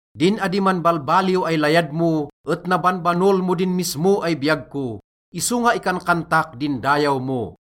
Din adi manbalbaliw ay layad mo et nabanbanol mo din mismo ay biyag ko, isonga ikankantak din dayaw mo.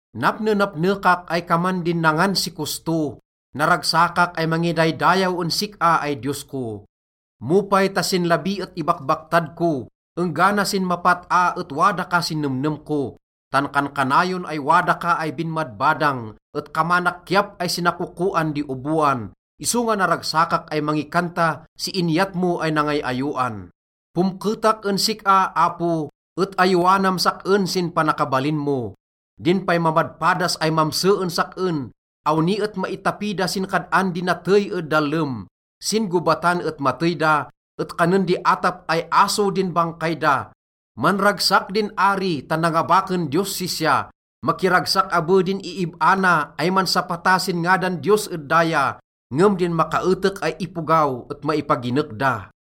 Napnenapnekak ay kaman din nangan si kosto, naragsakak ay mangidaydayaw en sik-a ay Diyos ko. Mo pay ta sin labi et ibakbaktad ko, enggana sin mapat-a et wada ka sin nemnem ko. Tan kankanayon ay wada ka ay binmadbadang, et kamanak kiyap ay sinasakokoan di oboan, isonga naragsakak ay mangikanta si inyat mo ay nangay-ayowan. Pomketak en sik-a, Apo, et ayowanam sak-en sin panakabalin mo. Din pay mamadpadas ay mamse en sak-en, awni et maitapi da sin kad-an di natey ed dallem. Sin gobatan et matey da, et kanen di atap ay aso din bangkay da. Manragsak din ari tan nangabaken Diyos sisya. Makiragsak abe din iib-a na ay mansapata sin ngadan Diyos ed daya, ngem din makaetek ay ipogaw et maipaginek da.